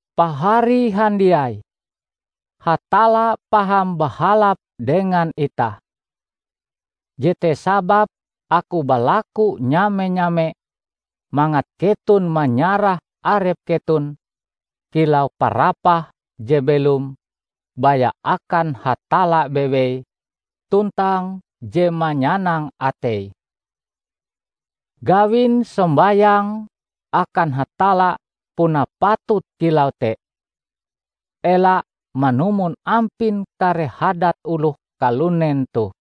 Pahari handiai! Hatalla paham bahalap dengan itah. Jete sababe aku balaku nyame-nyame mangat keton manyarah arep keton kilau parapah je belom baya akan Hatalla bewei tuntang je manyanang ateie. Gawin sombayangm akan Hatalla puna patut kilau te. Ela manumon ampin kare hadat oloh kalunen toh.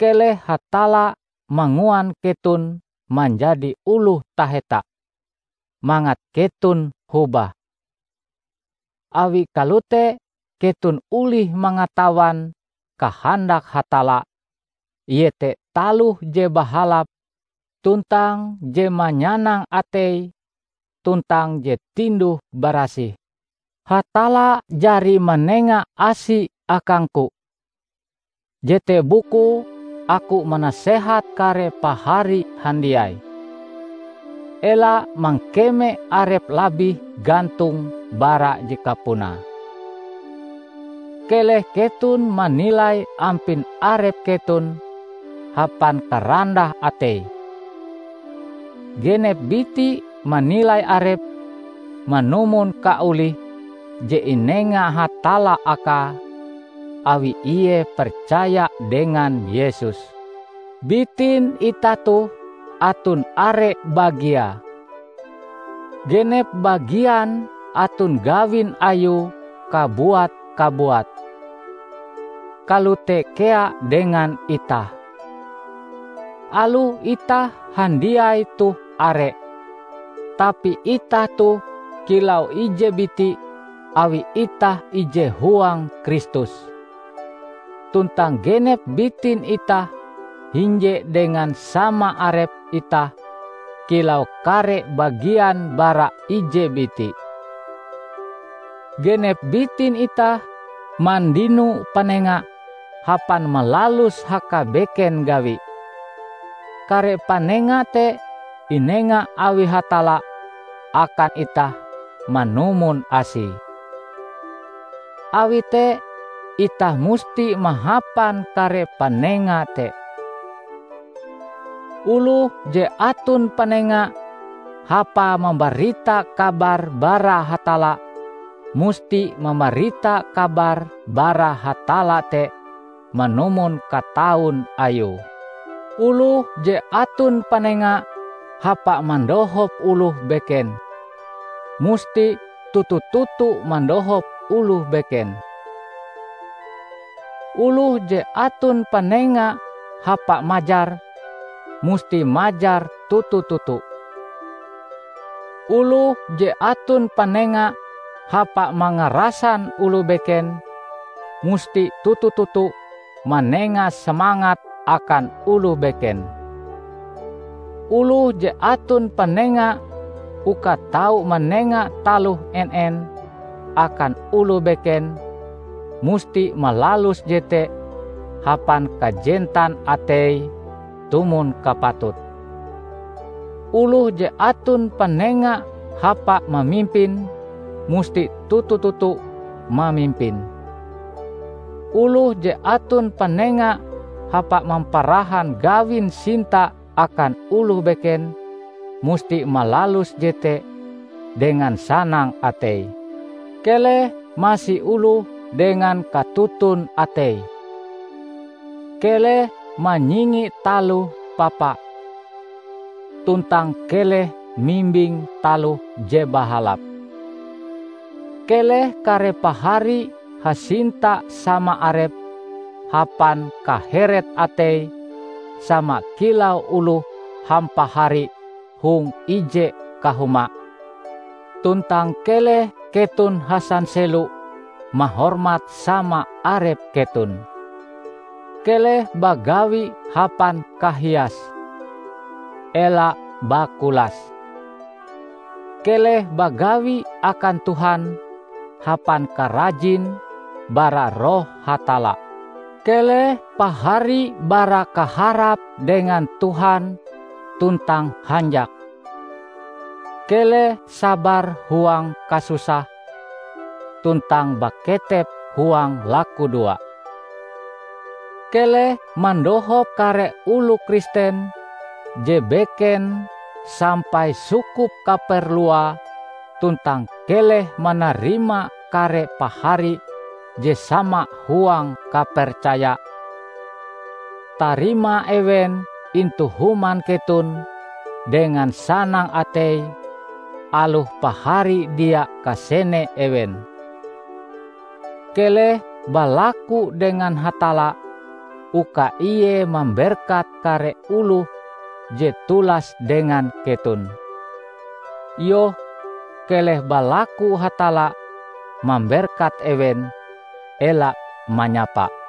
Keleh Hatalla manguan keton manjadi oloh taheta, mangat keton hobah. Awi kalote keton olih mangatawan kahandak Hatalla -- iete taloh je bahalap tuntang je manyanang ateie tuntang je tinduh-barasih. Hatalla jari manenga asi akangku. Jete bukue aku manasehat kare Pahari handiai: Ela mangkeme arep labih gantong bara je kapunae. Keleh keton manilai ampin arep keton hapan karandah atei; genep biti manilai arepe manumon kaolihe je inenga Hatalla akae awi ie percaya dengan Yesus. Bitin itah toh aton are bagiae. Genep bagian aton gawin ayue kabuat-kabuat. Kalote kea dengan itah. Aloh itah handiai toh are, tapi itah toh kilau ije biti awi itah ije huang Kristus. Tuntang genep bitin itah hinje dengan sama arep itah kilau kare bagian bara ije biti. Genep bitin itah mandino panenga hapan malalus hakabeken gawi. Kare panenga te inenga awi Hatalla akan itah manumon Asie. Awi te itah musti mahapan kare panenga te. Oloh je aton panenga hapae mambarita kabar bara Hatalla, musti mambarita kabar bara Hatalla te manumon kataun Ayue. Oloh je aton panenga hapa mandohop oloh beken, musti toto-toto mandohop oloh beken. Oloh je aton panenga hapa majar, musti majar toto-toto. Oloh je aton panenga hapa mangarasan oloh beken, musti toto-toto manenga semangat akan oloh beken. Oloh je aton panenga uka tau manenga taloh en-en akan oloh beken, musti malalus jete hapan kajentan ateie tumon kapatute. Oloh je aton panenga hapa mamimpin, musti toto-toto mamimpin. Oloh je aton panenga hapa mamparahan gawin sinta akan oloh beken, musti malalus jete dengan sanang atei. Keleh masi oloh dengan katoton atei. Keleh manyingi taloh papa, tuntang keleh mimbing taloh je bahalap. Keleh kare pahari hasinta sama arep hapan kaheret atei sama kilau oloh hampahari hong ije kahuma, tuntang keleh keton hasanselo mahormat sama arep keton. Keleh bagawi hapan kahias. Ela bakulas. Keleh bagawi akan Tuhan hapan karajin bara Roh Hatalla. Keleh pahari barakaharap dengan Tuhan tuntang hanjak, keleh sabar huang kasusah, tuntang baketep huang lakudoa. Keleh mandohop kare oloh Kristen je beken sampai sukup kaperluae tuntang keleh manarima kare pahari je sama huang kapercaya, tarima ewen intu human keton dengan sanang atei aloh pahari dia kasene ewen. Keleh balaku dengan Hatalla uka ie mamberkat kare oloh je tulas dengan keton. Iyoh, keleh balaku Hatalla mamberkat ewen, ela manyapa.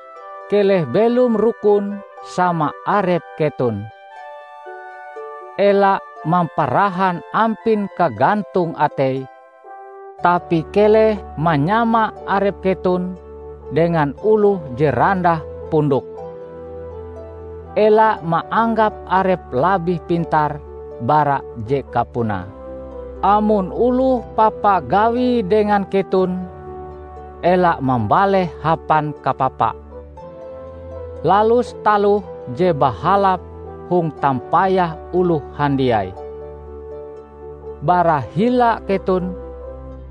Keleh belom rukun sama arep keton. Ela mamparahan ampin kagantong atei, tapi keleh manyama arep keton dengan oloh je randah pondoke. Ela maanggap arep labih pintar bara je kapunae. Amon oloh papa gawie dengan keton, ela mambaleh hapan kapapa. Lalus taloh je bahalap hong tampayah oloh handiai. Bara hila keton,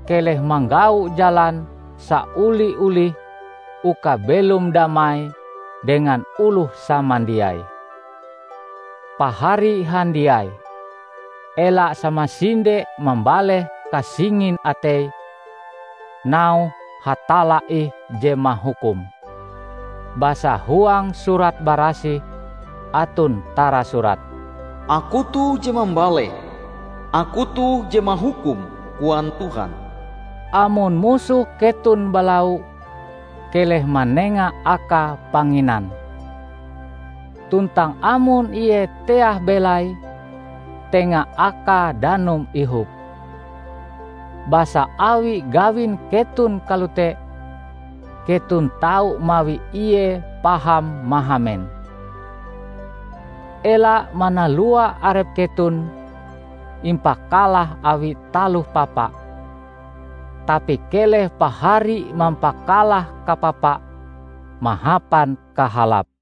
keleh manggau jalan saoli-olih uka belom damai dengan oloh samandiai. Pahari handiai! Ela samasinde mambaleh kasingin atei, nauhe Hatalla ih je mahukum. Basa huang Surat Barasih aton tarasurat, "Aku toh je mambaleh. Aku toh je mahukum, koan Tuhan." Amon musoh keton balau, keleh manenga akae panginan; tuntang amon ie teah belaie, tenga akae danum ihop. Basa awi gawin keton kalote, keton tau mawi ie paham mahamen. Ela manalua arep keton impakalah awi taloh papa, tapi keleh pahari mampakalah kapapa mahapan kahalap.